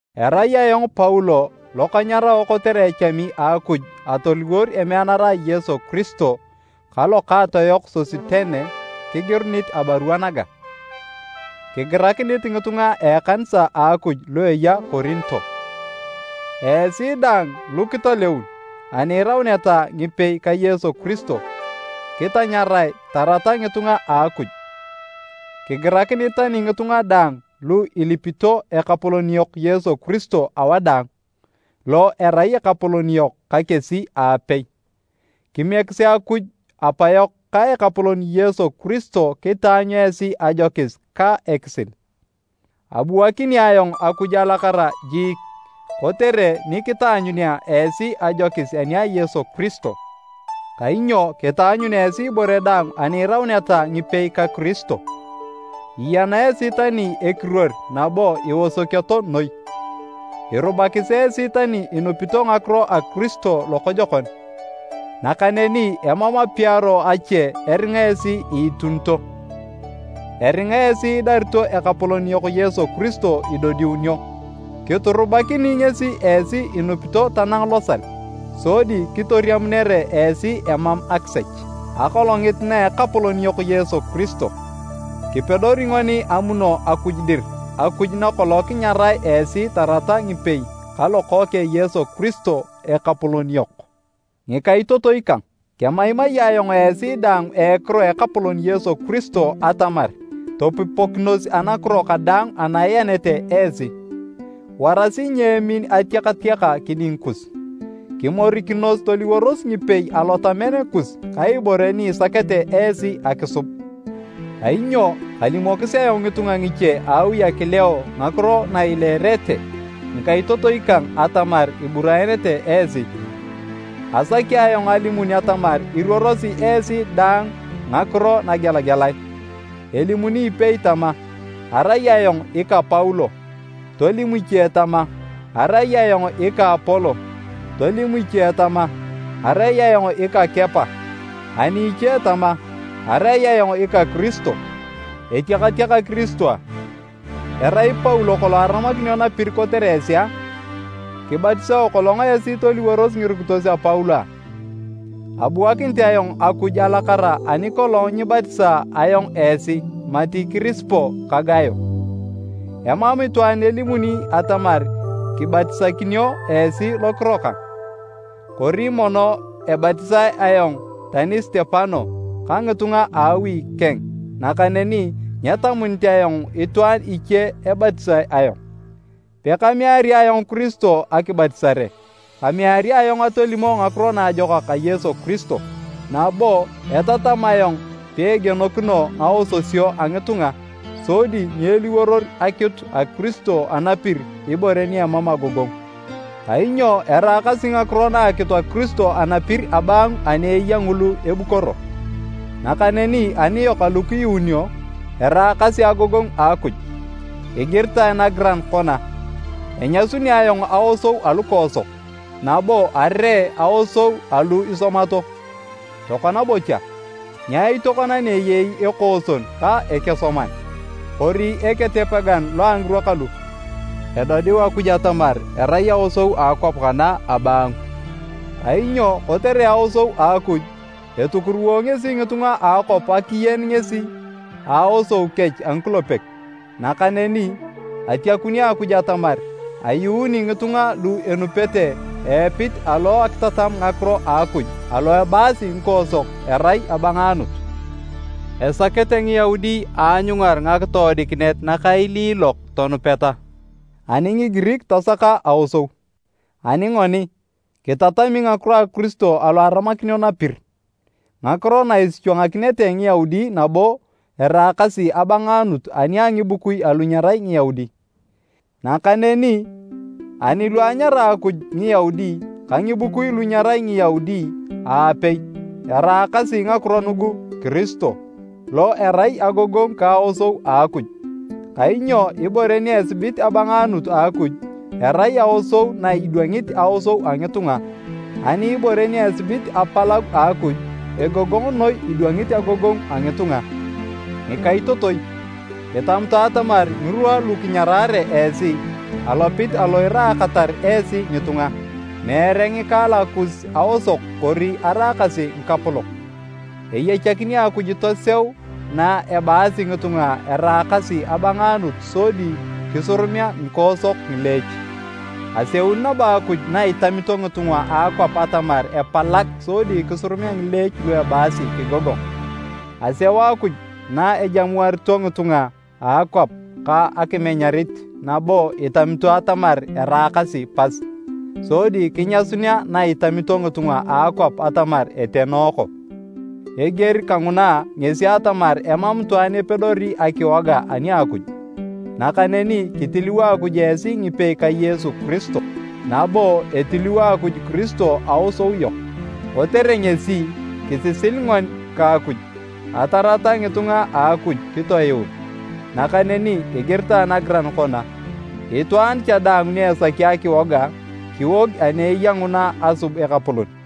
Erai ayong Paulo lo kanyarao kotere echami a Akuj atoliwor emeanara a Yesu Kiristo, ka lokaato yok Sositene kigirunit abarua naga, Kigirakinit ngitunga a ekanisa a Akuj lu eya Korinto. Esi daang lukitaleun ani irauneta ngipei ka Yesu Kiristo, kitanyarae tarata ngitunga a Akuj. Kigirakinit tani ngitunga daang lu ilipito Ekapolon yok Yesu Kiristo awadaang, lo erai Ekapolon yok ka kesi aapei! Kimiekisi Akuj Apayok ka Ekapolon Yesu Kiristo kitaanyut esi ajokis ka ekisil. Abuanakini ayong Akuj alakara jiik kotere ni kitaanyunea esi ajokis ani a Yesu Kiristo. Kainyo kitaanyun esi ibore daang ani irauneta ngipei ka Kiristo, iyena esi tani ekiruor nabo iosokioto noi. Irubakis esi tani inupito ngakiro a Kiristo lokojokon. Nakaneni emam apiaro ache eringa esi iitunito, eringa esi idarito Ekapolon yok Yesu Kiristo idodiunio. Kiturubakini ngesi esi inupito tanang losal, sodi kitoriamunere esi emam akisech, Akolongit na Ekapolon yok Yesu Kiristo. Kipedori ngoni amuno Akuj dir, Akuj nakolong kinyarae esi tarata ngipei ka Lokookeng Yesu Kiristo, Ekapolon yok. Ngikaitotoi kang, kemaimai ayong esi daang a ekiro a Ekapolon Yesu Kiristo atamar topupokinos anakiro kadaang ana ianete esi. Warasi nyeemin atiakatiaka kiding kus. Kimorikinos toliworos ngipei alotamen kus ka ibore ni isakete esi akisub. Kainyo kalimokis ayong ngitunga ngiche a awi a Kileo ngakiro na ileerete ngikaitotoi kang atamar iburaenete esi. Asaki ayong alimun atamar iruorosi esi daang ngakiro nagelagelae. Elimuni ipei tama, “Arai ayong ika Paulo,” tolim iche tama, “Arai ayong ika Apolo,” tolim iche tama, “Arai ayong ika Kepa,” ani iche tama, “Arai ayong ika Kiristo.” Etiakatiaka Kiristo a? Erai Paulo kolong aramakinio napir kotere esi a? Kibatisao kolong esi toliworos ngirukitos a Paulo a? Abuakinit ayong Akuj alakara ani kolong nyibatisaa ayong esi mati Kirispo ka Gayo. Emam itwaan elimuni atamar kibatisakinio esi lokiro kang. ( Kori mono ebatisae ayong tani Sitepanas ka ngitunga a awi keng nakaneni nyetamunit ayong itwaan iche ebatisae ayong.) Pekameari ayong Kiristo akibatisare, kameari ayong atolimo Ngakiro Naajokak a Yesu Kiristo. Nabo, etatam ayong peegienokino ngaososio a ngitunga sodi nyeliworor akitu a Kiristo anapir ibore ni emam agogongu. Kainyo eraakasi ngakiro na a akitu a Kiristo anapir abaangu ani eya ngulu ebukoro. Nakaneni aniyok alu kiyuununio, eraakasi agogongu a Akuj. Igiritae nagiran kona, “Enyasuni ayong aosou alukoosok nabo aree aosou alu isomato.” Tokona bocha, nyaai tokona ni eyei ekooson ka ekesoman? Kori eketepegan lo a ngirwa kalu? Edodiu Akuj atamar erai aosou a akwap kana abaangu! Kainyo kotere aosou a Akuj, etukuruwo ngesi ngitunga a akwap akiyen ngesi a aosou kech a ngikulepek. Nakaneni, atiakuni Akuj atamar ayuuni ngitunga lu enupete a epit alo akitatam ngakiro a Akuj alo ebaasi ngikoosok erai “abangaanut”. Esakete Ngiyaudi aanyungar ngakitoodikinet nakailiilok tonupeta, ani Ngigirik tasaka aosou. Ani ngoni, kitatami ngakiro a Kiristo alo aramakinio napir, ngakiro na isichwangakinete Ngiyaudi nabo eraakasi abangaanut ani a ngibukui alu nyerai Ngiyaudi. Nakaneni ani lu anyara Akuj, Ngiyaudi ka ngibukui lu nyerai Ngiyaudi aapei, eraakasi ngakiro nugu Kiristo, lo erai agogongu ka aosou a Akuj. Kainyo ibore ni esibit abangaanut a Akuj, erai aosou na idwangit aosou a ngitunga, ani ibore ni esibit apalagu a Akuj, egogong noi idwangit agogongu a ngitunga. Ngikaitotoi, kitamutu atamar ngirwa lu kinyarare esi, alopit alo iraakatar esi ngitunga, meere ngikaalak kus aosok kori araakasi ngikapolok. Eyachakini Akuj toseu na ebaasi ngitunga eraakasi abangaanut sodi kisurumea ngikoosok ngileech. Aseuni nabo Akuj na itamito ngitunga a akwap atamar epalag sodi kisurumea ngileech lu ebaasi kigogong. Aseu Akuj na ejamuarito ngitunga a akwap ka akimenyarit nabo itamito atamar eraakasi pas, sodi kinyasunea na itamito ngitunga a akwap atamar etenooko. Eger kanguna ngesi atamar emam itwaan epedori akiwoga ani a Akuj. Nakaneni kitiliwo Akuj esi ngipei ka Yesu Kiristo, nabo etiliwo Akuj Kiristo aosou yok, kotere ngesi, kisisil ngoni ka Akuj, atarata ngitunga a Akuj kitoyuun. Nakaneni igiritae nagiran kona, “Itwaan cha daang ni esaki akiwoga, kiwog ani eya nguna asub Ekapolon.”